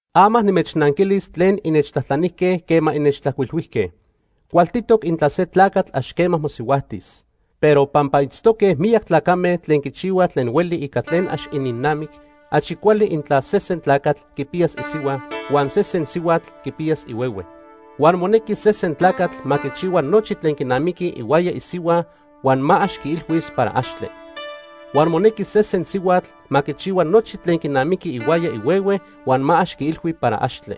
Ama nimechnanquilis tlen innechtlajtlanijque quema innechtlajcuilhuijque. Cualtitoc intla se tlacatl ax quema mosihuajtis. Pero, pampa itztoque miyac tlacame tlen quichihuaj tlen hueli ica tlen ax ininnamic, achi cuali intla sesen tlacatl quipiyas isihua, huan sesen sihuatl quipiyas ihuehue. Huan monequi sesen tlacatl ma quichihua nochi tlen quinamiqui ihuaya isihua huan ma ax quiilhuis para axtle. Huan monequi sesen sihuatl ma quichihua nochi tlen quinamiqui ihuaya ihuehue huan ma ax quiilhui para axtle.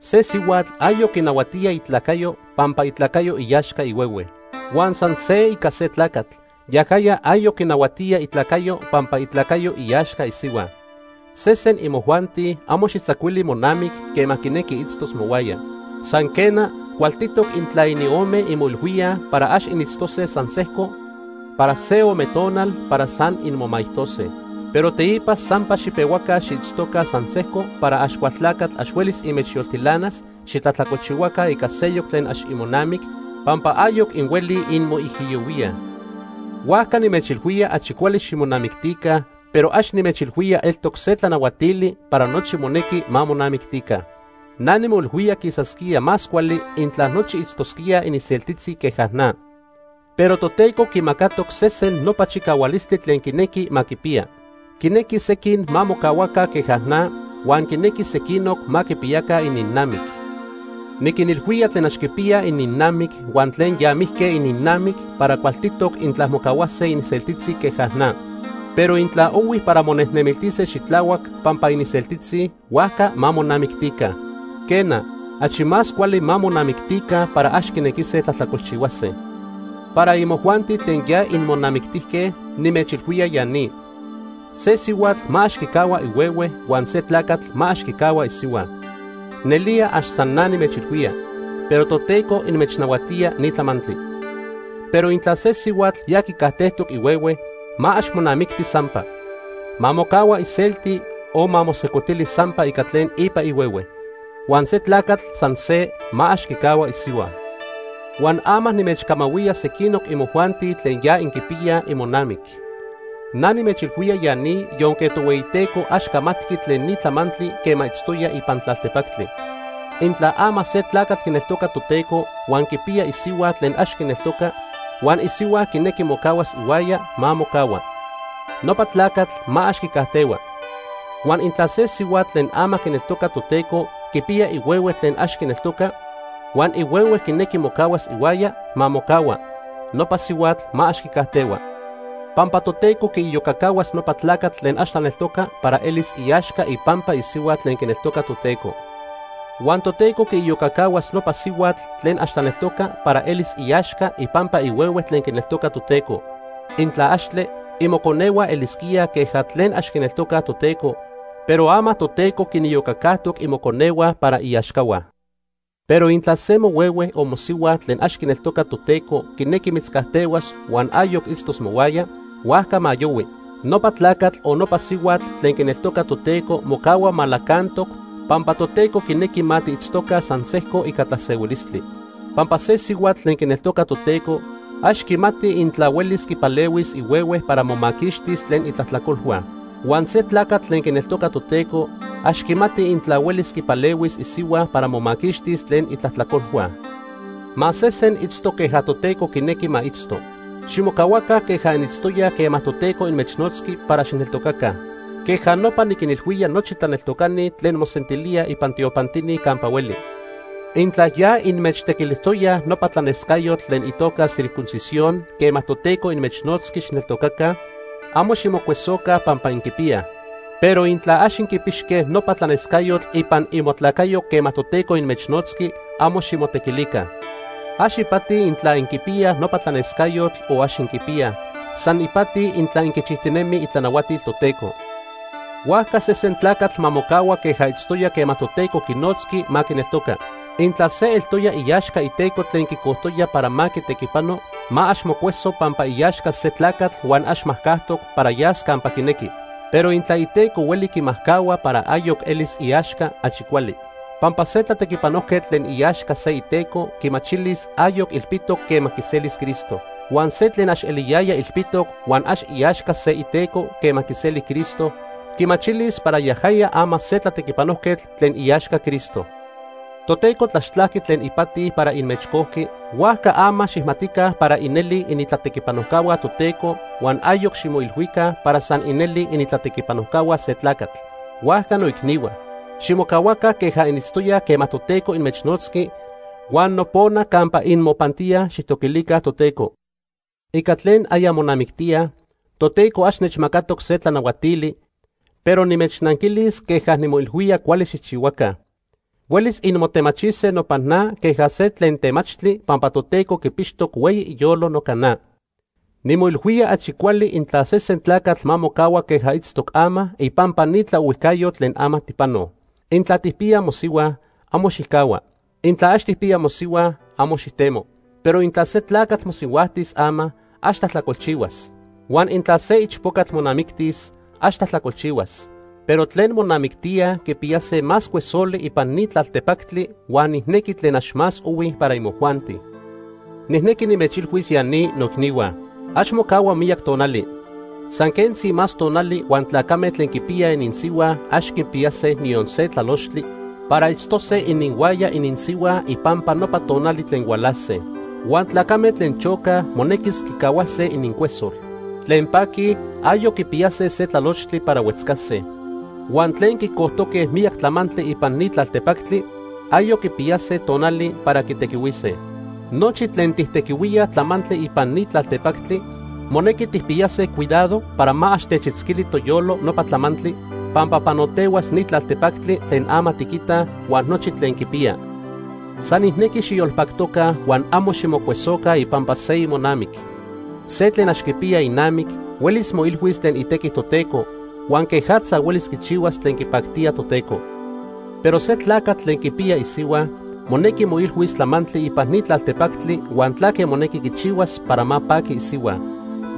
Se sihuatl ayoc quinahuatía itlacayo pampa itlacayo iaxca ihuehue. Huan san se ica se tlacatl, yajaya ayoc quinahuatía itlacayo pampa itlacayo iaxca isihua. Sesen imojuanti amo xijtzacuili monamic quema quinequi itztos mohuaya. San quena, cualtitoc intla inome inmoilhuíaj para ax initztose san sejco para se ome tonal para san inmomaijtose. Pero teipa sampa xipehuaca xiitztoca san sejco para Axcualtlacatl ax huelis inmechyoltilanas xitlajtlacolchihuaca ica seyoc tlen ax imonamic pampa ayoc inhuelij inmoijiyohuíaj. Huajca nimechilhuía achi cuali ximonamictica, pero ax nimechilhuía eltoc se tlanahuatili para nochi monequi ma monamictica. Na nimoilhuía quisasquía más cuali intla nochi itztosquíaj ininseltitzi queja na. Pero Toteco quimacatoc sesen nopa chicahualistli tlen quinequi ma quipiya. Quinequi sequin ma mocahuaca queja na, huan quinequi sequinoc ma quipiyaca ininnamic. Niquinilhuía tlen ax quipiyaj ininnamic huan tlen ya mijque ininnamic para cualtitoc intla mocahuase ininseltitzi queja na. Pero intla ohui para monejnemiltise xitlahuac pampa ininseltitzi, huajca ma monamictica. Quena, achi más cuali ma monamictica para ax quinequise tlajtlacolchihuase. Para imojuanti tlen ya inmonamictijque, nimechilhuía ya ni. Se sihuatl ma ax quicahua ihuehue huan se tlacatl ma ax quicahua isihua. Nelía ax san na nimechilhuía, pero Toteco inmechnahuatía ni tlamantli. Pero intla se sihuatl ya quicajtejtoc ihuehue, ma ax monamicti sampa. Ma mocahua iselti o ma mosejcotili sampa ica tlen ipa ihuehue. Huan se tlacatl san se ma ax quicahua isihua. Huan ama nimechcamahuía sequinoc imojuanti tlen ya inquipiyaj imonamic. Na nimechilhuía ya ni yonque Tohueyiteco ax camatqui tlen ni tlamantli quema itztoya ipan tlaltepactli. Intla ama se tlacatl quineltoca Toteco huan quipiya isihua tlen ax quineltoca, huan isihua quinequi mocahuas ihuaya, ma mocahua. Nopa tlacatl ma ax quicajtehua. Huan intla se sihuatl tlen ama quineltoca Toteco quipiya ihuehue tlen ax quineltoca, huan ihuehue quinequi mocahuas ihuaya, ma mocahua. Nopa sihuatl ma ax quicajtehua. Pampa Toteco quiiyocacahuas nopa tlacatl tlen ax tlaneltoca para elis iaxca ipampa isihua tlen quineltoca Toteco. Huan Toteco quiiyocacahuas nopa sihuatl tlen ax tlaneltoca para elis iaxca ipampa ihuehue tlen quineltoca Toteco. Intla axtle, imoconehua elisquíaj queja tlen ax quineltocaj Toteco, pero ama Toteco quiniyocacajtoc imoconehua para iaxcahua. Pero intla se mohuehue o mosihua tlen ax quineltoca Toteco quinequi mitzcajtehuas huan ayoc itztos mohuaya, huajca ma yohui. Nopa tlacatl o nopa sihuatl tlen quineltoca Toteco mocahua malacantoc pampa Toteco quinequi ma tiitztoca san sejco ica tlasehuilistli. Pampa se sihuatl tlen quineltoca Toteco, ax quimati intla huelis quipalehuis ihuehue para momaquixtis tlen itlajtlacolhua. Huan se tlacatl tlen quineltoca Toteco, ax quimati intla huelis quipalehuis isihua para momaquixtis tlen itlajtlacolhua. Ma sesen itzto queja Toteco quinequi ma itzto. Ximocahuaca queja initztoyaj quema Toteco inmechnotzqui para xijneltocaca. Queja nopa niquinilhuía nochi tlaneltocani tlen mosentilíaj ipan tiopantini campa hueli. Intla ya inmechtequilijtoyaj nopa tlanescayotl tlen itoca circuncisión quema Toteco inmechnotzqui xijneltocaca, amo ximocuesoca pampa inquipiyaj. Pero intla ax inquipixque nopa tlanescayotl ipan imotlacayo quema Toteco inmechnotzqui, amo ximotequilica. Ax ipati intla inquipiyaj nopa tlanescayotl o ax inquipiyaj, san ipati intla inquinchijtinemij itlanahuatil Toteco. Huajca sesen tlacatl ma mocahua queja itztoya quema Toteco quinotzqui ma quineltoca. Intla se eltoya iaxca iteco tlen quicojtoya para ma quitequipano, ma ax mocueso pampa iaxca se tlacatl huan ax majcajtoc para yas campa quinequi. Pero intla iteco hueli quimajcahua para ayoc elis iaxca, achi cuali. Pampa se tlatequipanojquetl tlen iaxca se iteco quimachilis ayoc ilpitoc quema quiselis Cristo. Huan se tlen ax eliyaya ilpitoc huan ax iaxca se iteco quema quiseli Cristo, quimachilis para yajaya ama se tlatequipanojquetl tlen iaxca Cristo. Toteco tlaxtlajqui tlen ipati para inmechcojqui, huajca ama xijmatica para inelij initlatequipanojcahua Toteco huan ayoc ximoilhuica para san inelij initlatequipanojcahua se tlacatl. Huajca noicnihua, ximocahuaca queja initztoyaj quema Toteco inmechnotzqui huan nopona campa inmopantíaj, xijtoquilica Toteco. Ica tlen aya monamictíaj, Toteco ax nechmacatoc se tlanahuatili, pero nimechnanquilis queja nimoilhuía cuali xijchihuaca. Huelis inmotemachise nopan na queja se tlen temachtli pampa Toteco quipixtoc hueyi iyolo noca na. Nimoilhuía achi cuali intla sesen tlacatl ma mocahua queja itztoc ama ipampa ni tlaohuijcayotl tlen ama tijpanoj. Intla tijpiya mosihua, amo xijcahua. Intla ax tijpiya mosihua, amo xijtemo. Pero intla se tlacatl mosihuajtis ama, ax tlajtlacolchihuas. Huan intla se ichpocatl monamictis, ax tlajtlacolchihuas. Pero tlen monamictíaj quipiyase más cuesoli ipan ni tlaltepactli huan nijnequi tlen ax más ohui para imojuanti. Nijnequi nimechilhuis ya ni, noicnihua. Ax mocahua miyac tonali. San quentzi más tonali huan tlacame tlen quipiyaj ininsihua ax quipiyase niyon se tlalochtli para itztose ininhuaya ininsihua ipampa nopa tonali tlen hualase. Huan tlacame tlen chocaj monequis quicahuase inincuesol. Tlen paquij, ayoc quipiyase se tlalochtli para huetzcase. Huan tlen quicojtoque miyac tlamantli ipan ni tlaltepactli, ayoc quipiyase tonali para quitequihuise. Nochi tlen tijtequihuíaj tlamantli ipan ni tlaltepactli, monequi tijpiyase cuidado para ma ax techitzquili toyolo nopa tlamantli, pampa panotehuas ni tlaltepactli tlen ama tiquitaj huan nochi tlen quipiya. San nijnequi xiyolpactoca huan amo ximocuesoca ipampa se imonamic. Se tlen ax quipiya inamic huelis moilhuis tlen itequi Toteco huan quejatza huelis quichihuas tlen quipactía Toteco, pero se tlacatl tlen quipiya isihua, monequi moilhuis tlamantli ipan ni tlaltepactli huan tlaque monequi quichihuas para ma paqui isihua.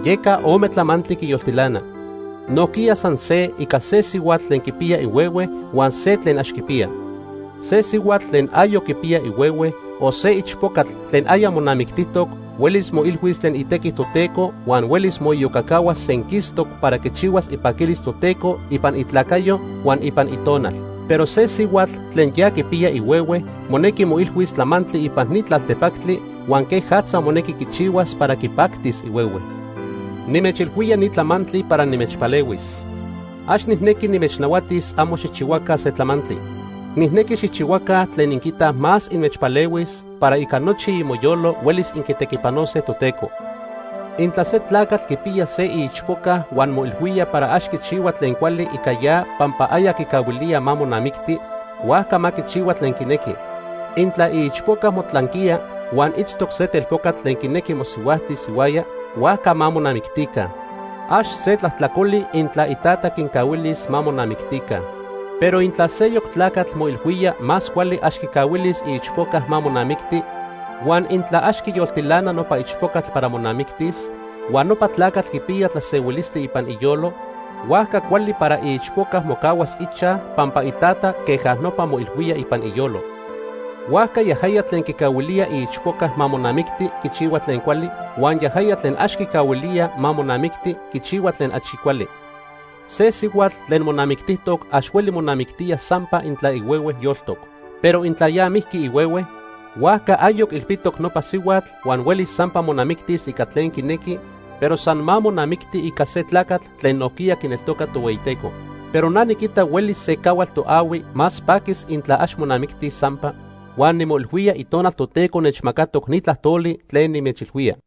Yeca ome tlamantli quiyoltilana. Nojquiya san se ica se sihuatl tlen quipiya ihuehue huan se tlen ax quipiya. Se sihuatl tlen ayoc quipiya ihuehue, o se ichpocatl tlen aya monamictijtoc huelis moilhuis tlen itequi Toteco huan huelis moiyocacahuas senquistoc para quichihuas ipaquilis Toteco ipan itlacayo huan ipan itonal. Pero se sihuatl tlen ya quipiya ihuehue monequi moilhuis tlamantli ipan ni tlaltepactli huan quejatza monequi quichihuas para quipactis ihuehue. Nimechilhuía ni tlamantli para nimechpalehuis. Ax nijnequi nimechnahuatis amo xijchihuaca se tlamantli. Nijnequi xijchihuaca tlen inquiitaj más inmechpalehuis para ica nochi imoyolo huelis inquitequipanose Toteco. Intla se tlacatl quipiya se iichpoca huan moilhuía para ax quichihua tlen cuali ica ya pampa aya quicahuilía ma monamicti, huajca ma quichihua tlen quinequi. Intla iichpoca motlanquiya huan itztoc se telpocatl tlen quinequi mosihuajtis ihuaya, huajca ma monamictica. Ax se tlajtlacoli intla itata quincahuilis ma monamictica. Pero intla seyoc tlacatl moilhuía más cuali ax quicahuilis iichpoca ma monamicti, huan intla ax quiyoltilana nopa ichpocatl para monamictis, huan nopa tlacatl quipiya tlasehuilistli ipan iyolo, huajca cuali para iichpoca mocahuas ichaj pampa itata queja nopa moilhuía ipan iyolo. Huajca yajaya tlen quicahuilía iichpoca ma monamicti quichihua tlen cuali, huan yajaya tlen ax quicahuilía ma monamicti quichihua tlen achi cuali. Se sihuatl tlen monamictijtoc ax hueli monamictía sampa intla ihuehue yoltoc. Pero intla ya mijqui ihuehue, huajca ayoc ilpitoc nopa sihuatl huan huelis sampa monamictis ica tlen quinequi, pero san ma monamicti ica se tlacatl tlen nojquiya quineltoca Tohueyiteco. Pero na niquita huelis se cahual toahui más paquis intla ax monamictis sampa, huan nimoilhuía Itonal Toteco nechmacatoc ni tlajtoli tlen nimechilhuía.